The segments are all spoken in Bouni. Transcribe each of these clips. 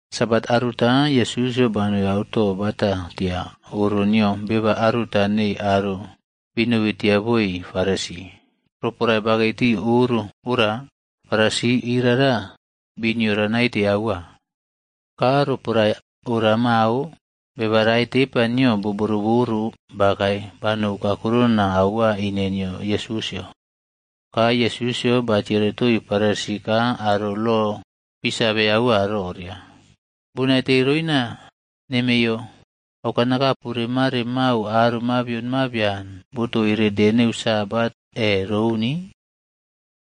Sabat aruta, Yesusꞌyo banoi auto bata tia oro nio beba aruta nei aro binobi tia boi Farisi. Roporae bakei tii oro ora, Farisi irara biniora naite aua. Ka roporae ora mao, beba rae tepa nio bo boroꞌboro bakae banou kakurona aua ine nio Yesusꞌyo. Ka Yesusꞌyo batiere toii Farisi ka aro lo bii save aua roria, “Bonaite roina nemeiyo aukanakapu remare mau aro mabion mabian botoire de neu Sabat e roun?”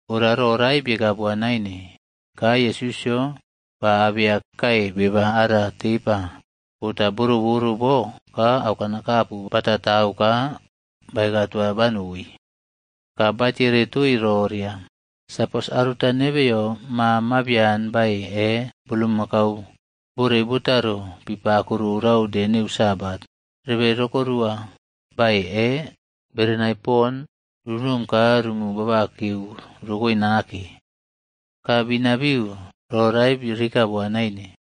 Ora ro rae bieka boa naine. Ka Yesusꞌyo ba abeya kae beba ara tepa bota boroꞌboro bo ka aukanakapu batatau ka baeka toa banoi. Ka ba tiere toii roria, “Sapos aruta nebeyo ma mabian bae e bulmakau borei botaro pipako rorau de neu Sabat, rebe rokorua bae e berenai pon runom ka rumu babakeu rokoe nake?” Ka binabiu ro rae rieka boa naine.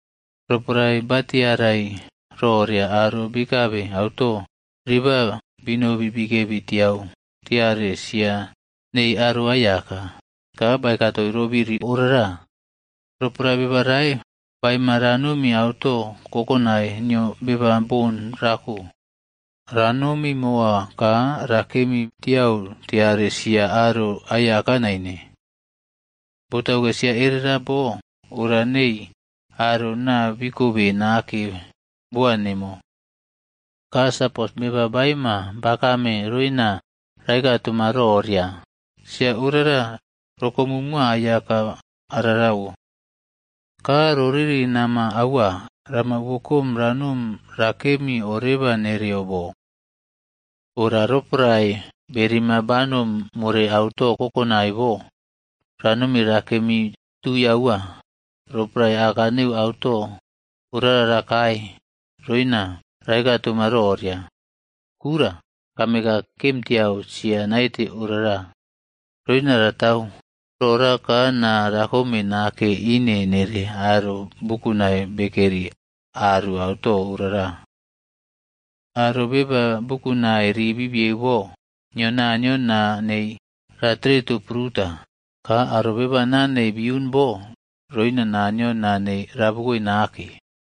Roporae ba tiarai roria aro bikabe auto riba binobi bikebi tiau tiare sia neii aro aiyaka, ka baeka toii ro biri orara. “Roporae beba rae baema ranomi auto kokonai nio beba bon rako, ranomi moa ka rakemi tiau tiare sia aro aiyaka naine. Botauke sia erera bo ora nei aro naa bikobe nake boa nemo. Ka sapos, beba baeima bakame roina raeka toma roria, ‘Sia orara rokomu moa aiyaka ararawo.’ Ka roriri nama aua rama wokom ranom rakemi oreba nereyo bo. Ora roporae berima banom more auto kokonai bo, ranomi rakemi tui aua. Roporae aka neu auto orara rakae, roina raeka toma roria, ‘Kura, kame ka kemtiau sia naite orara.’ Roina ratau rora ka naa rakom nake ine nere aro bukunai bekeri aru auto orara. Aro beba bukunai ribibieu bo nio Naniyo naa nei ratereto pruta. Ka aro beba naa nei biiun bo roina Naniyo naa nei rabukoe nake.”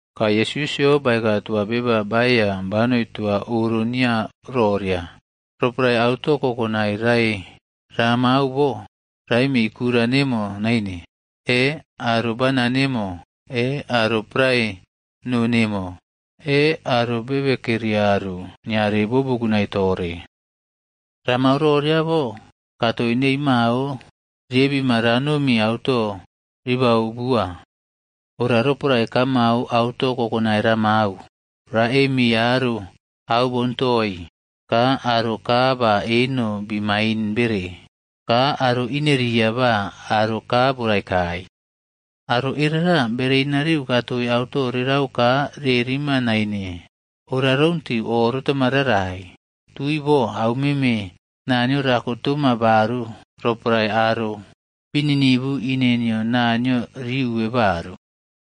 Ka Yesusꞌyo baeka toa beba baeiya banoi toa oro nio roria, “Roporae auto kokonai rae ramau bo, raemii kura nemo naine, e aro bana nemo e aro prae noo nemo e aro bebe keri aru niare bo bukunai tore. Ramau roria bo, katoi nei mao riebima ranomi auto ribau bua. Ora roporae kamau auto kokonai ramau, raꞌemi aro au boun toii, ka aro kaa ba eno bii maine bere, ka aro ineria ba aro kaa borai kai. Aro erera bere inariu katoi auto rerau ka rerima naine. Ora rountiu oꞌrotama rarai, tui bo au meme Naniyo rako toma baru roporae aro bi ninivu ine nio Naniyo riuwe baru.”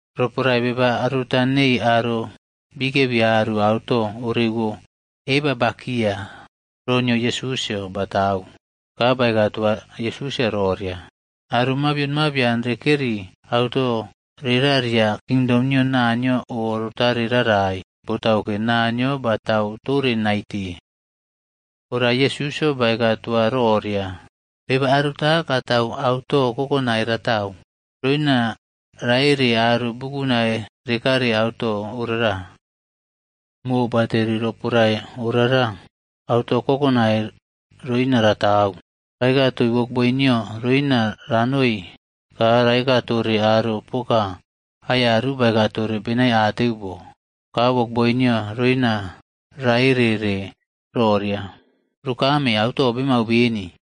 Roporae beba aruta neii aro bikebi aru auto orewo eba bakia ro nio Yesusꞌyo batau, ka baeka toa Yesusꞌyo roria, “Aro mabion mabian rekeri auto rera ria kingdom nio Naniyo o rotare rarai, botauke Naniyo batau tore naite.” Ora Yesusꞌyo baeka toa roria, “Beba aruta katau auto kokonai ratau, roina raere aro bukunai rekare auto orara. Mobateri roporae orara auto kokonai roina ratau, raekatoi wokboi nio roina ranoi ka raeka tore aro poka aiyaru baeka tore benaiateu bo. Ka wokboi nio roina raereꞌre roria, ‘Rukame, auto bemau beni.’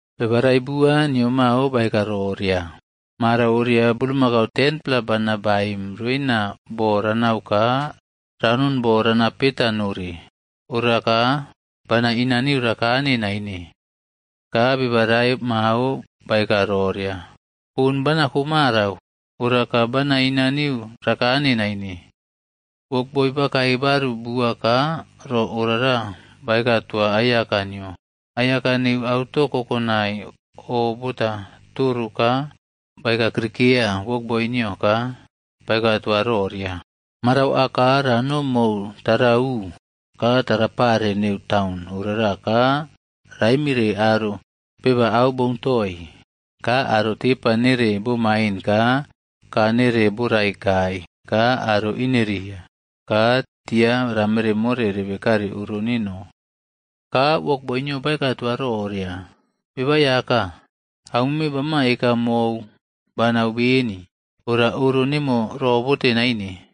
“Beba rae bua, nio mao baeka roria, ‘Marau oria bulmakau 10-pla bana baem roina bo ranau ka ranon bo rana peta nore. Oraka bana inaiu rakane naine.’ “Ka beba rae mao baeka roria, ‘Bon banako marau, ora ka bana inaniu rakane naine.’ “Wokboi bakae baru bua ka ro orara baeka toa aiyaka nio. Aiyaka neu auto kokonai o bota toro ka baeka krikeya wokboi nio ka baeka toa roria, ‘Marau aka ranom mou tarau ka tarapare neu taun orara ka raemire aro beba au boun toii, ka aro tepa nere bomaine ka kaa nere borai kai ka aro ineria. Ka tia ramere more rebe kare oro neno.’ “Ka wokboi nio baeka toa roria, ‘Beba Aiyaka, aumeme bama eka mou, banau beni, ora oro nemo robote naine.’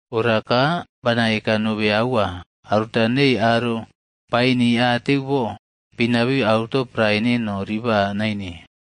Ora ka bana eka nobe aua, aruta neii aro baenii ateu bo, binabiu auto prae neno riba naine.’”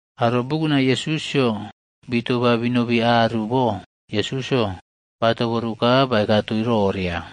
Aro bukunai Yesusꞌyo bitoba binobi aru bo Yesusꞌyo batoboru ka baeka toii roria,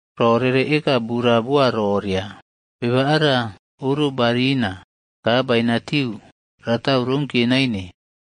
Ro rere eka bura boa roria, ‘Beba ara oro barina, ka bainatiu ratau rounkiye naine.’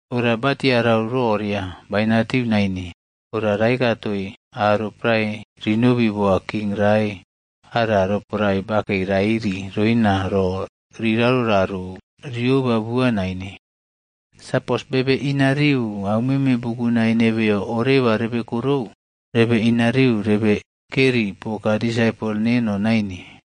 Ora batiarau roria bainatiu naine, ora raeka toii aro prae rinobi boa king rae ara roporae bakei rairi roina ro rirarou rarou rioba bua naine. Sapos bebe inariu aumeme bukunai nebeyo oꞌrebekorou, rebe inariu rebe keri poka disaipol neno naine.”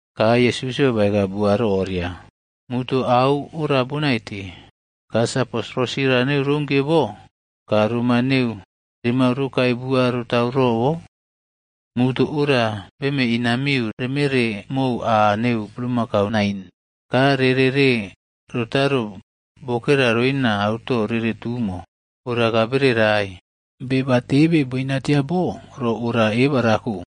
“Ka Yesus baeka bua roria, muto au ora bonaite, ka sapos rosira neu rounkiye bo, ka roma neu remau rokae bua rotau robo? Muto ora beme inamiu remeꞌre mou aa neu bulmakau nain, ka reꞌrere rotaro bokera roina auto rere tumo, ora ka bere rae. Beba tebe boina tia bo ro oria eba rako.”